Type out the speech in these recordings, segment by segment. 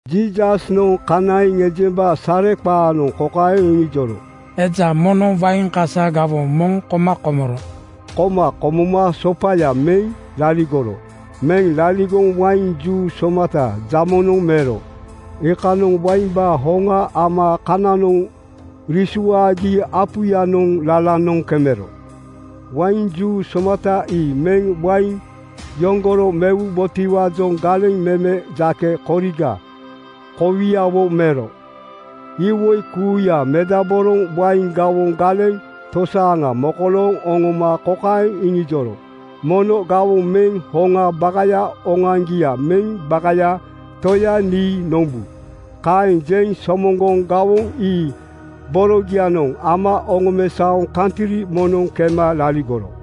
Jiisasnoŋ kanaiŋ ejemba sareqaanoŋ kokaeŋ iŋijoro, “Eja moŋnoŋ wain kasa gawoŋ moŋ koma komoro. Koma komoma sopaya meŋ liligoro. Meŋ liligoŋ wain juu somata jamonoŋ mero. Iikanoŋ waimbaa hoŋa ama kananoŋ risuaagi apuyanoŋ lalanoŋ kemero. Wain juu somata ii meŋ wain yoŋgoro mewubotiwaajoŋ galeŋ meme jake koriga kowiawo mero. Iwoi kuuya medaboroŋ wain gawoŋ galeŋ tosaaŋa mokolooŋ oŋoma kokaeŋ iŋijoro, ‘Mono gawoŋ meŋ hoŋaa bakaya oŋoaŋgia meŋ bakaya toya nii nombu.’ Kaeŋ jeŋ somoŋgoŋ gawoŋ ii borogianoŋ ama oŋomesaoŋ kantri moŋnoŋ kema laligoro.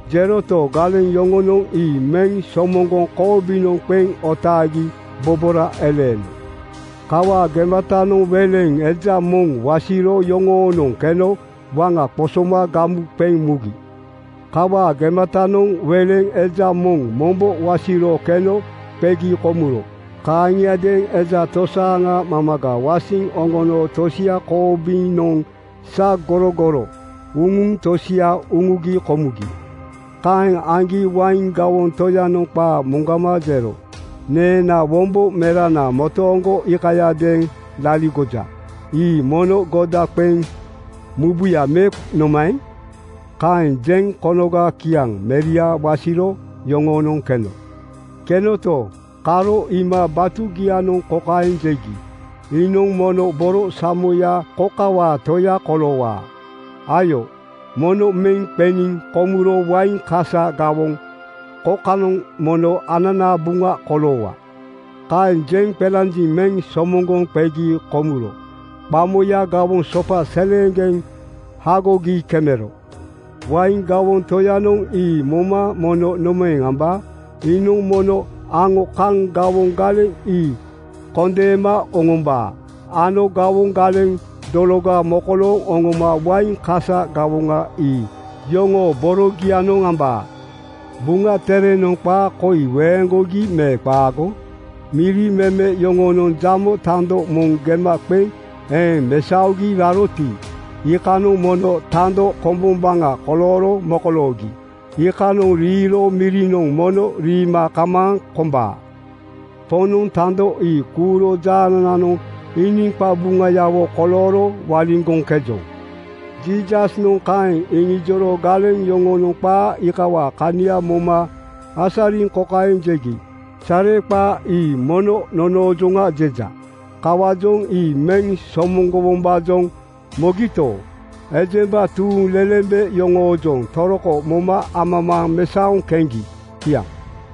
Jeroto, galeŋ yoŋonoŋ ii meŋ somoŋgoŋ koobinoŋ qeŋ otaagi bobora eleeno. Kawaa gematanoŋ weleŋ eja moŋ wasiro yoŋoonoŋ keno waŋa qosoma gamu qeŋ mugi. Kawaa gematanoŋ weleŋ eja moŋ mombo wasiro keno qegi komuro. Kaaŋiadeeŋ eja tosaaŋa mamaga wasiŋ oŋono tosia koobinoŋ sagorogoro uŋuŋ tosia uŋugi komugi. Kaeŋ aŋgi wain gawoŋ toyanoŋ qaa moŋgama jero, ‘Neenaa wombo merana motooŋgo iikayadeeŋ laligoja. Ii mono goda qeŋ mubuya me nomaeŋ?’ Kaeŋ jeŋ konoga kiaŋ meria wasiro yoŋoonoŋ keno. Kenoto, karo iima batugianoŋ kokaeŋ jegi, ‘Iinoŋ mono borosamoya kokawaa toya koloowaa. Ayo, mono meŋ qeniŋ komuro wain kasa gawoŋ kokanoŋ mono ananaa buŋa koloowaa.’ Kaeŋ jeŋ qelanjiŋ meŋ somoŋgoŋ qegi komuro qamoya gawoŋ sopa seleeŋgeŋ hagogi kemero. “Wain gawoŋ toyanoŋ ii moma mono nomaeŋ ambaa? Iinoŋ mono aŋo kaŋ gawoŋ galeŋ ii kondeema oŋombaa ano gawoŋ galeŋ dologa mokolooŋ oŋoma wain kasa gawoŋa ii yoŋoo borogianoŋ ambaa. Buŋa Terenoŋ qaa koi weeŋgogi me qaago? ‘Miri meme yoŋonoŋ jamo tando moŋ gema qeŋ eeŋ mesaogi raroti, iikanoŋ mono tando kombombaŋa kolooro mokoloogi. Iikanoŋ riiro mirinoŋ mono riima kamaaŋ kombaa. Poŋnoŋ tando ii kuuro jaanananoŋ iiniŋ qabuŋayawo kolooro waliŋgoŋkejoŋ.” ’ Jiisasnoŋ kaeŋ iŋijoro galeŋ yoŋonoŋ qaa iikawaa kania moma asariŋ kokaeŋ jegi. “Sareqaa ii mono nonoojoŋa jeja.” Kawaajoŋ ii meŋ somoŋgowombaajoŋ mogito, ejemba tuuŋlelembe yoŋoojoŋ toroko moma amamaaŋ mesaoŋ keŋgi. Kiaŋ.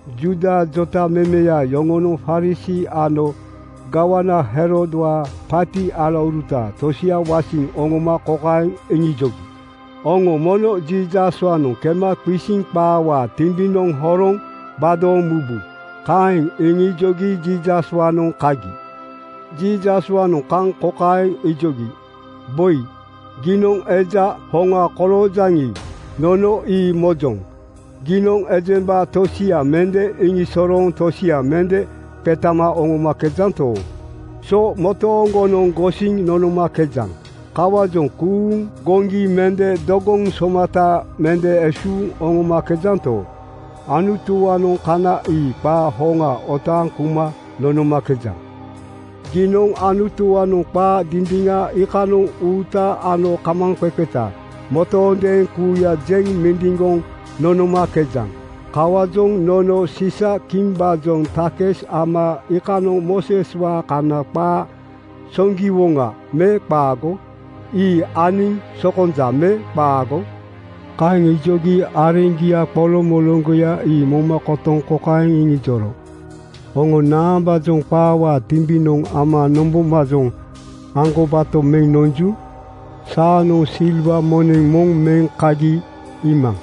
Juuda jotamemeya yoŋonoŋ Farisii ano gawana Herodwaa paati alauruta tosia wasiŋ oŋoma kokaeŋ iŋijogi, “Oŋo mono Jiisaswaanoŋ kema qisiŋ qaawaa timbinoŋ horoŋ gbadooŋ mubu.” Kaeŋ iŋijogi Jiisaswaanoŋ kagi. Jiisaswaanoŋ kaŋ kokaeŋ ijogi, “Boi, giinoŋ eja hoŋa koloojaŋi, nono ii mojoŋ. Giinoŋ ejemba tosia mende iŋisosorooŋ tosia mende qetama oŋomakejanto, so motooŋgonoŋ gosiŋ nonomakejaŋ. Kawaajoŋ kuuŋ goŋgi mende dogoŋ somata mende esuuŋ oŋomakejanto, Anutuwaanoŋ kana ii qaa hoŋa otaaŋ kuma nonomakejaŋ. Giinoŋ Anutuwaanoŋ qaa dindiŋa iikanoŋ uuta ano kamaaŋqeqeta motoondeeŋ kuuya jeŋ mindiŋgoŋ nonomakejaŋ. Kawaajoŋ nono siisa-kimbaajoŋ takis ama iikanoŋ Mooseswaa Kana qaa soŋgiwoŋa me qaago? Ii aniŋ sokonja me qaago?” Kaeŋ ijogi areŋgia qoloŋmoloŋgoya ii moma kotoŋ kokaeŋ iŋijoro, “Oŋo naambaajoŋ qaawaa timbinoŋ ama nombombaajoŋ aŋgobato meŋ nonju? Saanoŋ silwa moneŋ moŋ meŋ kagi iimaŋ.”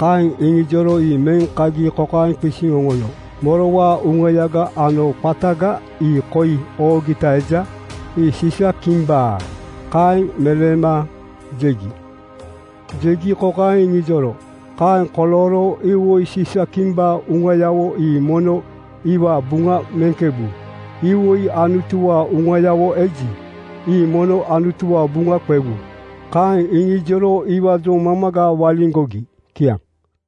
Kaeŋ iŋijoro ii meŋ kagi kokaeŋ qisiŋ oŋono. “Morowaa uŋayaga ano qataga ii koi oogita eja?” “Ii Siisa-kimbaa.” Kaeŋ meleema jegi. Jegi kokaeŋ iŋijoro, “Kaeŋ kolooro iwoi Siisa-kimbaa uŋayawo ii mono iwaa buŋa muŋkebu. Iwoi Anutuwaa uŋayawo eji, ii mono Anutuwaa buŋa qewu.” Kaeŋ iŋijoro iwaajoŋ mamaga waliŋgogi. Kiaŋ.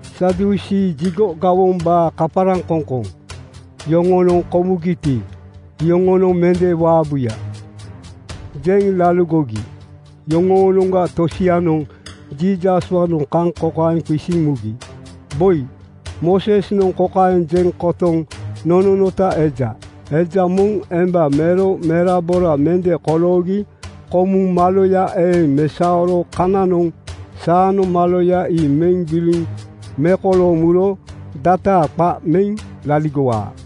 Sadusii (Jigo gawombaa kaparaŋkoŋkoŋ) yoŋonoŋ “Komugiti, iyoŋonoŋ mende waabuya,” jeŋ laligogi. Yoŋoonoŋga tosianoŋ Jiisaswaanoŋ kaŋ kokaeŋ qisiŋ mugi, “Boi, Moosesnoŋ kokaeŋ jeŋ kotoŋ nononota eja, ‘Eja moŋ emba mero merabora mende koloogi komuŋ maloya eeŋ mesaoro koganoŋ saanoŋ maloya ii meŋ gbili mekolooŋ muro dataa qa meŋ laligowaa.’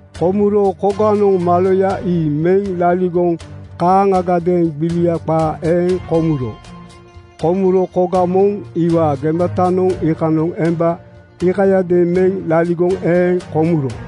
Komuro koganoŋ maloya ii meŋ laligoŋ kaaŋagadeeŋ gbilia qaa eeŋ komuro. Komuro koga moŋ iwaa gematanoŋ iikanoŋ emba iikayadeeŋ meŋ laligoŋ eeŋ komuro.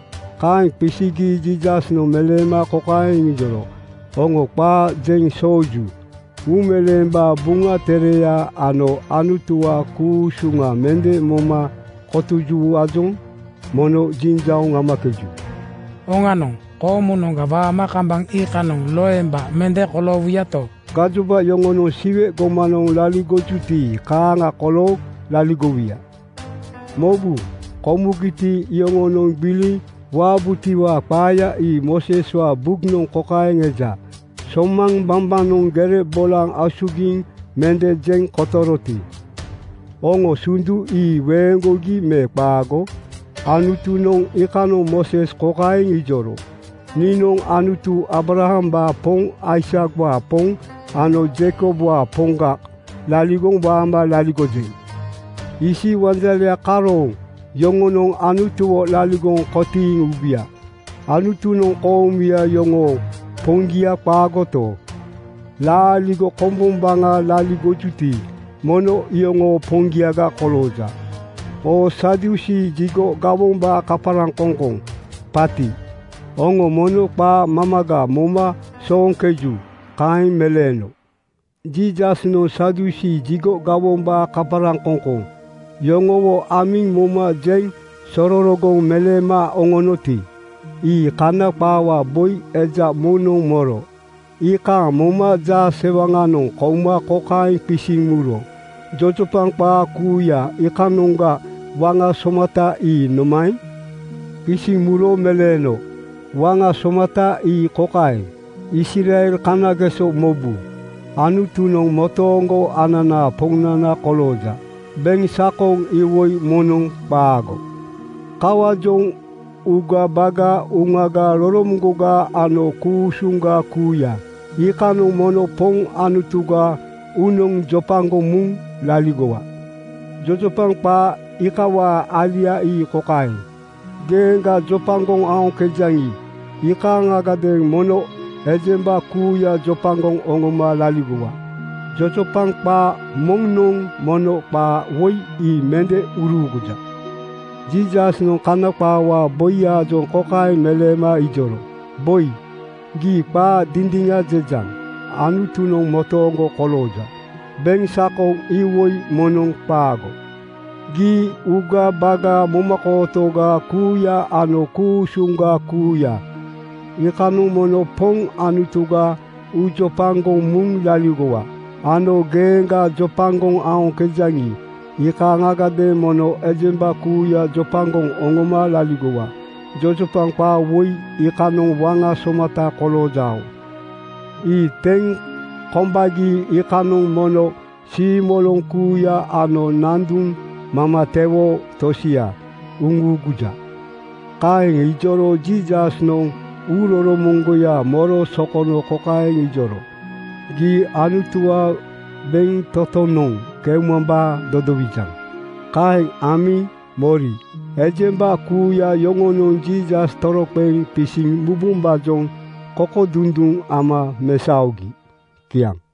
Kaeŋ qisigi Jiisasnoŋ meleema kokaeŋ iŋijoro, “Oŋo qaa jeŋ sooju. Uumeleembaa Buŋa Tereya ano Anutuwaa ku-usuŋa mende moma kotojutiwaajoŋ mono jiŋjauŋ amakeju. Oŋanoŋ, koomunoŋga waama kambaŋ iikanoŋ loemba mende koloowuyato, gajoba yoŋonoŋ Siwe gomanoŋ laligojuti kaaŋa kolooŋ laligowuya. Mobu! Komugiti, iyoŋonoŋ gbiliŋ waabutiwaa qaaya ii Mooseswaa Buknoŋ kokaeŋ eja: Somaŋ bambanoŋ gere bolaŋ asugiŋ mende jeŋ kotoroti, oŋo sundu ii weeŋgogi me qaago? Anutunoŋ iikanoŋ Mooses kokaeŋ ijoro, ‘Niinoŋ Anutu Aabrahambaa Poŋ, Aisakwaa Poŋ ano Jeikobwaa Poŋga laligoŋ waama laligojeŋ.’ “Isi wanjale karooŋ yoŋonoŋ Anutuwo laligoŋ kotiiŋ ubuya. Anutunoŋ koomuya yoŋoo Poŋgia qaagoto, laaligo kombombaŋa laligojuti, mono iyoŋoo Poŋgiaga kolooja. Oo Sadusii (Jigo gawombaa kaparaŋkoŋkoŋ paati) oŋo mono qaa mamaga moma sooŋkeju.” Kaeŋ meleeno. Jiisasnoŋ Sadusii (Jigo gawombaa kaparaŋkoŋkoŋ) yoŋowo amiŋ moma jeŋ sororogoŋ meleema oŋonoti, ii kana qaawaa boi eja moŋnoŋ moro. Iikaaŋ moma jaasewaŋanoŋ kouma kokaeŋ qisiŋ muro, “Jojopaŋ qaa kuuya iikanoŋga waŋa somata ii nomaeŋ?” Qisiŋ muro meleeno, “Waŋa somata ii kokaeŋ, ‘Israel kanageso mobu! Anutunoŋ motooŋgo ananaa Poŋnana kolooja. Beŋsakoŋ iwoi moŋnoŋ qaago. Kawaajoŋ uugabaga, uŋaga, roromoŋgoga ano ku-usuŋga kuuya, iikanoŋ mono Poŋ Anutuga uunoŋ jopagoŋ muŋ laligowa.’ “Jojopaŋ qaa iikawaa alia ii kokaeŋ, ‘Geeŋga jopagoŋ aoŋkejaŋi, iikaaŋadeeŋ mono ejemba kuuya jopagoŋ oŋoma laligowa,’ Jojopaŋ qaa moŋnoŋ mono qaa woi ii mende uruuguja.” Jiisasnoŋ Kana qaawaa boiyaajoŋ kaeŋ meleeno ijoro, “Boi, gii qaa dindiŋa jejaŋ. Anutunoŋ motooŋgo kolooja. Beŋsakoŋ iwoi moŋnoŋ qaago. Gii uugabaga, momakootoga kuuya ano ku-usuŋga kuuya, iikanoŋ mono Poŋ Anutuga uujopagoŋ muŋ laligowa. Ano geeŋga jopagoŋ aoŋkejaŋi, iikaaŋadeeŋ mono ejemba kuuya jopagoŋ oŋoma laligowa. Jojopaŋ qaa woi iikanoŋ waŋa somata koloojao. Ii teŋ kombagi, iikanoŋ mono siimoloŋ kuuya ano nanduŋ mamatewoo tosia uŋuuguja.” Kaeŋ ijoro Jiisasnoŋ uuroromoŋgoya moro sokono kokaeŋ ijoro, “Gii Anutuwaa bentotonoŋ keumambaa dodowijaŋ.” Kaeŋ amiŋ mori ejemba kuuya yoŋonoŋ Jiisas toroqeŋ qisiŋ mubombaajoŋ kokodunduŋ ama mesaogi. Kiaŋ.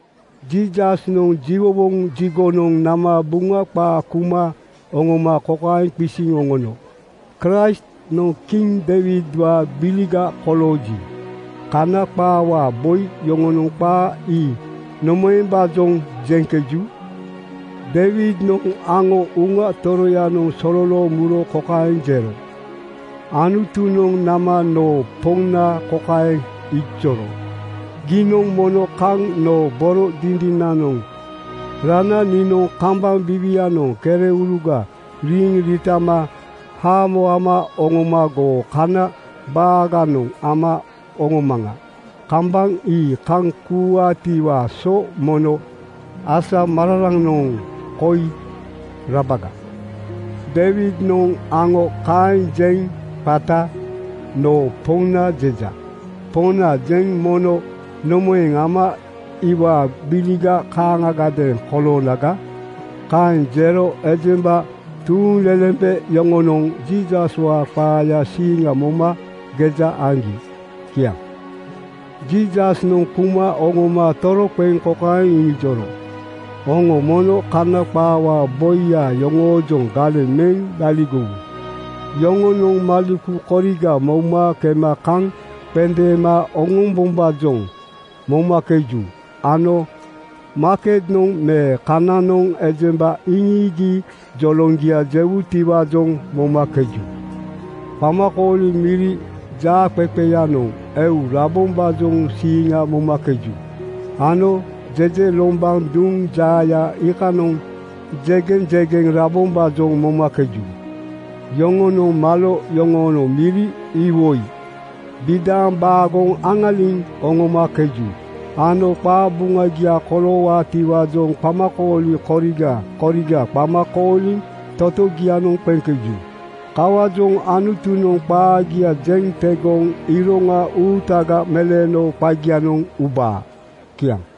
Jiisasnoŋ jiwowoŋ jigonoŋ nama Buŋa qaa kuma oŋoma kokaeŋ qisiŋ oŋono, “Kraistnoŋ kiŋ Deiwidwaa gbiliga kolooji, kana qaawaa boi yoŋonoŋ qaa ii nomaembaajoŋ jeŋkeju? Deiwidnoŋ aŋo Uŋa Toroyanoŋ sololooŋ muro kokaeŋ jero, ‘Anutunoŋ nama noo Poŋna kokaeŋ ijoro: Giinoŋ mono kaŋ noo boro dindinanoŋ rana niinoŋ kambaŋ biiwianoŋ kereuruga riiŋ riitama haamo ama oŋoma goo kana baaganoŋ ama oŋomaŋa. Kambaŋ ii kaŋ kuuwaatiwaa so mono asamararanoŋ koi rabaga.’ Deiwidnoŋ aŋo kaeŋ jeŋ qata ‘noo Poŋna jeja.’ Poŋna jeŋ mono nomaeŋ ama iwaa gbiliga kaaŋagadeeŋ koloonaga?” Kaeŋ jero ejemba tuuŋlelembe yoŋonoŋ Jiisaswaa qaayaa siiŋa moma geja aŋgi. Kiaŋ. Jiisasnoŋ kuma oŋoma toroqeŋ kokaeŋ iŋijoro, “Oŋo mono kana qaawaa boiya yoŋoojoŋ galeŋ meŋ laligowu. Yoŋonoŋ maleku koriga mouma kema kaŋ qendeema oŋombombaajoŋ momakeju ano maaketnoŋ me kananoŋ ejemba iŋiigi joloŋgia jewutiwaajoŋ momakeju. Qamakooli miri jaaqeqeyanoŋ eu rabombaajoŋ siiŋa momakeju ano jejelombanoŋ duŋ jaaya iikanoŋ jegeŋjegeŋ rabombaajoŋ momakeju. Yoŋonoŋ malo yoŋoonoŋ miri iwoi bidaaŋ baagoŋ aŋaliŋ oŋomakeju ano qabuŋagia koloowaatiwaajoŋ qamakooli koriga koriga qama kooliŋ totogianoŋ qeŋkeju. Kawaajoŋ Anutunoŋ qaagia jeŋ tegoŋ iroŋa uutaga meleeno qagianoŋ ubaa.” Kiaŋ.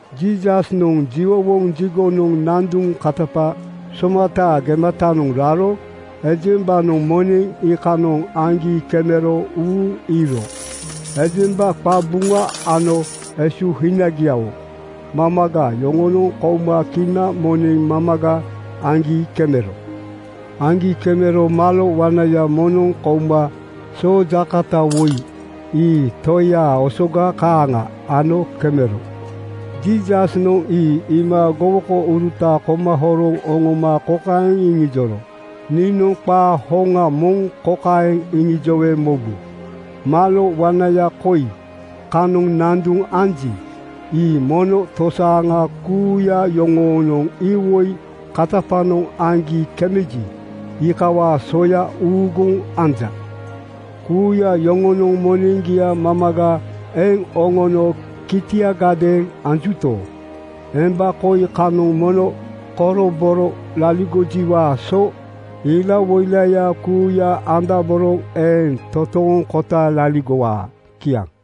Jiisasnoŋ jiwowoŋ jigonoŋ nanduŋ katapa somataa gematanoŋ raro ejembanoŋ moneŋ iikanoŋ aŋgi kemero uuŋ iŋiiro. Ejemba qabuŋa ano esuhinagiawo mamaga yoŋonoŋ kouma kina moneŋ mamaga aŋgi kemero. Aŋgi kemero malo wanaya moŋnoŋ kouma soojaakota woi, ii toiya osoga kaaŋa ano kemero. Jiisasnoŋ ii iima gowokouruta koma horoŋ oŋoma kokaeŋ iŋijoro, “Niinoŋ qaa hoŋa moŋ kokaeŋ iŋijowe mobu: Malo wanaya koi kanoŋ nanduŋ anji, ii mono tosaaŋa kuuya yoŋonoŋ iwoi katapanoŋ aŋgi kemeji, iikawaa soya uuguŋ anja. Kuuya yoŋonoŋ moneŋgia mamaga eŋ oŋono kitiagadeeŋ anjuto, emba koi kanoŋ mono koroboro laligojiwaa so ilawoilaya kuuya andaboroŋ eeŋ totooŋkota laligowaa.” Kiaŋ.